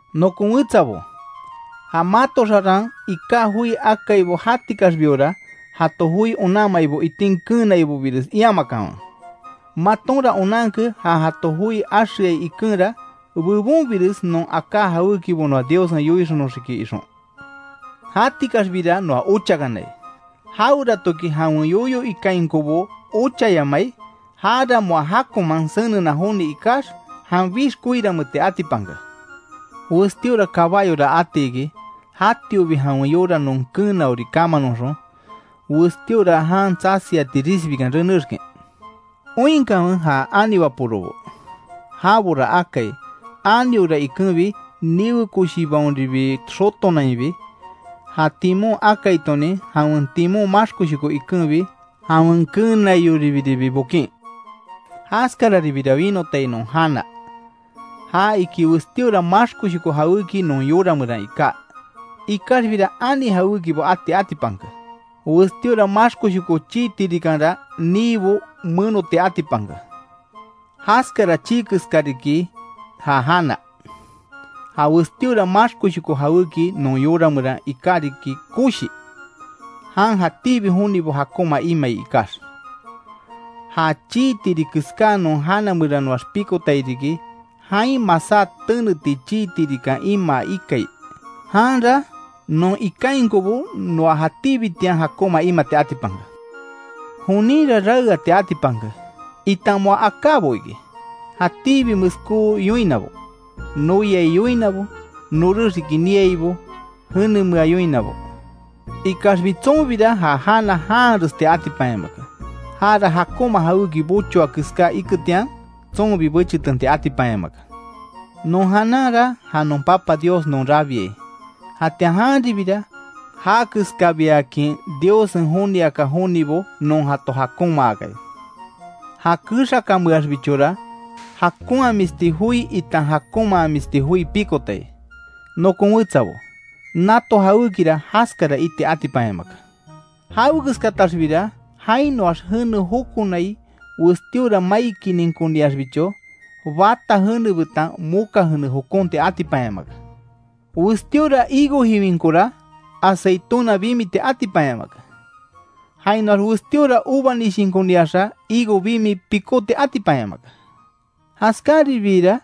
Nokon wetsabo, ja mato xaran iká joi akaibo jatikaxbiora, jato joi onanmaibo itin keenaibobires iamakanwe. Matonra onanke ja jato joi axeai ikenra, bebonbires non aká jawékibo noa Diossen yoixonoxiki ixon. Jatikaxbira noa ochakanai; jaweratoki jawen yoyo ikainkobo ochayamai, jara moa jakonman senena joni ikax, janbixbi koiranmeeti atipanke. Westíora kabayora ati iki, jatiobi jawen yora non keenaoribo kamanoxon, westíora jan tsasiati risbikan renexkin. Oinkanwe ja ani waporobo; jabora akai aniora ikenbi niwe koshibaonribi xotonainbi, ja timon akaitonin jawen timon maxkoshoko ikenbi, jawen keenaioribiribi bokin. Jaskararibira winotai non jana, ja iki westíora maxkoshoko jawéki non yora meran iká, ikaxbira ani jawékibo ati atipanke. Westíora maxkoshoko chii tirikanra niibo menoti atipanke. Jaskara chii keska riki ja jana. Ja westíora maxkoshoko jawéki non yora meran iká riki koshi, jan jatíbi jonibo jakonma imai ikax. Ja chii tiri keská non jana meranoax pikotai riki, jain masá teneti chii tirikan imaa ikai, janra non ikainkobo noa jatíbitian jakonma imati atipanke. Joninra raeati atipanke, itan moa akábo iki, jatíbi meskó yoinabo, noyai yoinabo, norex iki niaibo, jenemea yoinabo. Ikaxbi tsonbira ja jana janharesti atipanyamake, jara jakonma jawéki bochoa keská iketian, tsonbi bechitenti atipanyamake. Non jananra ja non Papa Dios non rabiai, jatian janribira já keskabiakin Diossen joniaka jonibo non jato jakonmaakai. Ja kexakanmeaxbichora jakonhamisti joi itan jakonmamisti joi pikotai. Nokon wetsabo, nato jawékira jaskara iti atipanyamake. Jawekeskataxbira jainoax jene jokonai westíora mai kininkoniaxbicho, bata jene betan moka jene jokonti atipanyamake. Westíora higo jiwinkora, aceituna bimiti atipanyamake; jainoax westíora uva nishinkoniaxa higo bimi pikóti atipanyamake. Jaskaribira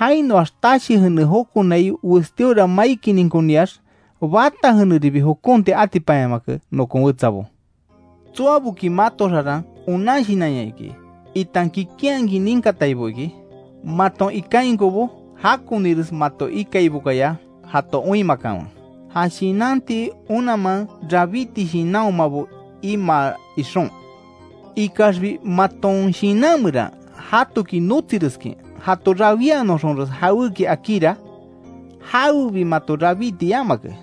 jainoax tashi jene jokonai westíora mai kininkoniax bata jeneribi jokonti atipanyamake nokon wetsabo. Tsoaboki mato xaran onan shinanya iki, itan kikinhakin ninkataibo iki, maton ikainkobo jakonires mato ikaibokaya jato oinmakanwe, ja shinanti onanman rabíti shinanhomabo imaa ixon. Ikaxbi maton shinan meran jatoki notsireskin jato rawíanoxonres jawéki akíra, jawebi mato rabíti yamake,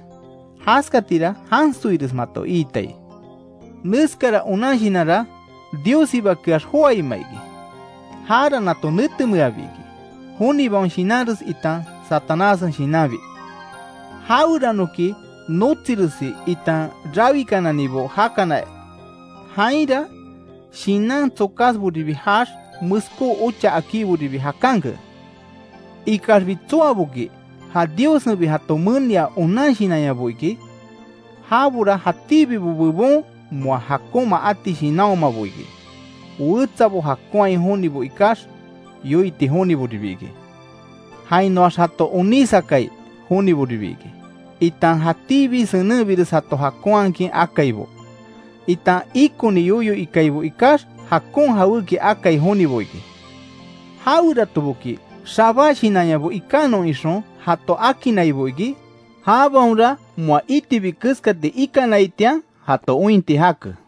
jaskatira jansoires mato iitai. Neskara onan shinanra Diossibakeax joáima iki; jara nato netemeabi iki, jonibaon shinanres itan Satanássen shinanbi. Jaweranoki notsiresi itan rawikananibo jakana, jainra shinan tsokásboribi jaax, meskó ocha akíboribi jakanke. Ikaxbi tsoaboki ja Diossenbi jato menia onan shinanyabo iki, jabora jatíbibo bebon moa jakonma ati shinanhomabo iki, wetsabo jakonhai jonibo ikax, yoiti joniboribi iki; jainoax jato onísakai joniboribi iki, itan jatíbibo senenbires jato jakonhakin akaibo, itan ikoni yoyo ikaibo ikax jakon jawéki akai jonibo iki. Jaweratoboki xabá shinanyabo ikanon ixon jato akinnaibo iki, jabaonra moa itibi keskati ikanaitian jato ointi jake.